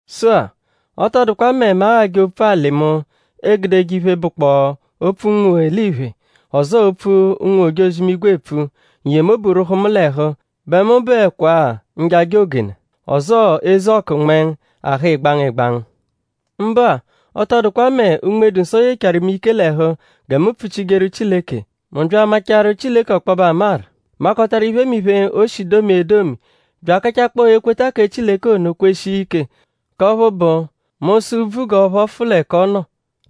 Sụ-a; ọ tọ dụkwa mẹ mu aghajẹ opfu-alị mu egudeje iphe, bụkpoo opfu ụnwu-eliphe; ọzoo opfu ụnwu-ojozi-imigwe epfu; n-yemobu rwụhu mu l'ẹhu bẹ mu bụekwaa njaja ogena; ọzoo eze ọkunmengu, aha ịgbangu ịgbangu. Mbụ-a; ọ tọ dụkwa mẹ Unme-dụ-Nsọ yechaaru mu ike l'ẹhu gẹ mu pfuchijeru Chileke; mu bya amachaaru Chileke ọkpobe amaru; makọtaru iphemiphe, o shi domia edomi; bya akachakpọo ekweta kẹ Chileke ono kweshia ike; k'ọphu bụ mu -sụ úbvú g'ọ phọfu l'ẹka ọ nọ;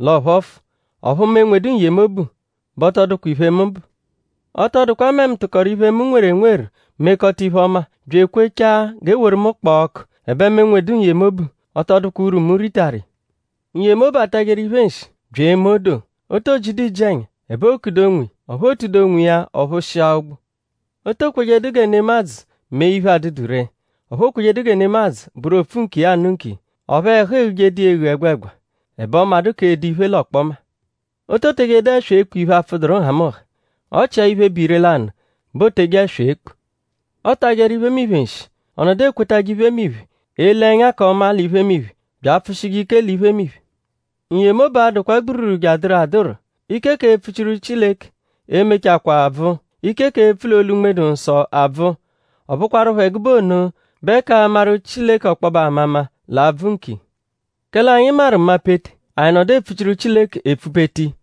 l'ọ phọfu; ọphu mu enwedu n-yemobu bẹ ọ tọ dụkwa iphe, mu bụ. Ọ tọ dụkwa mẹ mu tụkoru iphe, mu nweru enweru mekọta iphe-ọma; bya ekwechaa g'e woru mu kpọo ọku; ẹbe mu enwedu n-yemobu; ọ tọ dụkwa urwu, mu ritaru iya. N-yemobu atajeru iphe nshi; bya eme odoo. O to jidu iji-ẹnya. Ẹbe ookudu onwiya; ọphu o tudu onwiya ọ-phụshia-ụgbu. O to kwejedu gẹ nemadzụ mee iphe, adụdu ree; ọphu ookwejedu gẹ nemadzụ bụru o-pfu-nkiya-anụ-nkiya; ọphu ẹhu eghujedu iya eghu ẹgwegwa; ẹbe ọ madụ k'edo iphe l'ọkpoma. O to tejedu ẹswa ekpu iphe, apfụduru nhamụnha. Ọ chia iphe, bụ ire-lanụ bẹ o teje ẹswa ekpu. Ọotajeru iphemiphe nshi; ọ nọdu ekwetajẹ iphemiphe; ele ẹnya k'ọma l'iphemiphe; bya apfụ-shijẹ ike l'iphemiphe. N-yemobu a-dụkwa gbururu jeadụru adụru. Ike k'epfuchiru Chileke e-mechakwaa bvụ; ike k'epfu l'olu Unme-dụ-Nsọ abvụ. Ọ bụkwarupho ẹgube ono bẹ k'amaru Chileke ọkpobe amama l'a-bvụ nkiya. Kẹle anyi maru mapete; anyi nọdu epfuchiru Chileke epfupete iya.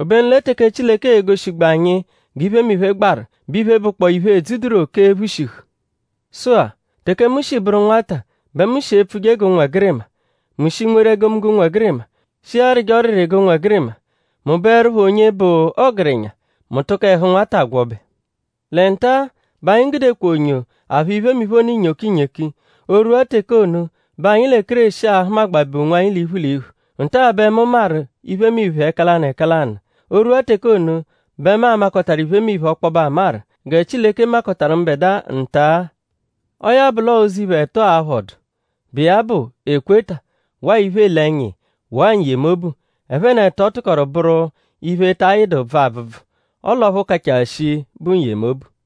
Obenu lẹ teke Chileke e-goshigbu anyi g'iphemiphe gbaru; bẹ iphe, bụkpoo iphe, edzuduru oke ephushihu. Sụ-a; teke mu shi bụru nwata bẹ mu shi epfuje g'ụnwegirima; mu shi nweru egomunggo ụnwegirima; shi arịje ọriri g'ụnwegirima. Mu bụerupho onye bụ ọgerenya; mu tụko ẹhu nwata gwọbe. Lẹ nta-a bẹ anyi gudekwa onyo aphụ iphemiphe ono inyoki inyoki. O -rwua teke ono bẹ anyi lẹ Kéreshi a-hụmagbabe onwanyi l'iphu l'iphu. Nta-a bẹ mu maru iphemiphe ẹka lanụ ẹka lanụ; o -rwua teke ono bẹ mu a-makọtaru iphemiphe ọkpobe amaru; gẹ Chileke makọtaru mbẹdua nta-a. Ọo ya bụ l'ọo ụzo iphe ẹto a-phọdu, bụ iya bụ ekweta; waa iphe, eele ẹnya iya; waa n-yemobu; ẹphe n'ẹto tụkoru bụru iphe, ta ayịdu bvụ abvụbvu; ọle ọphu kachaa shii bụ n-yemobu.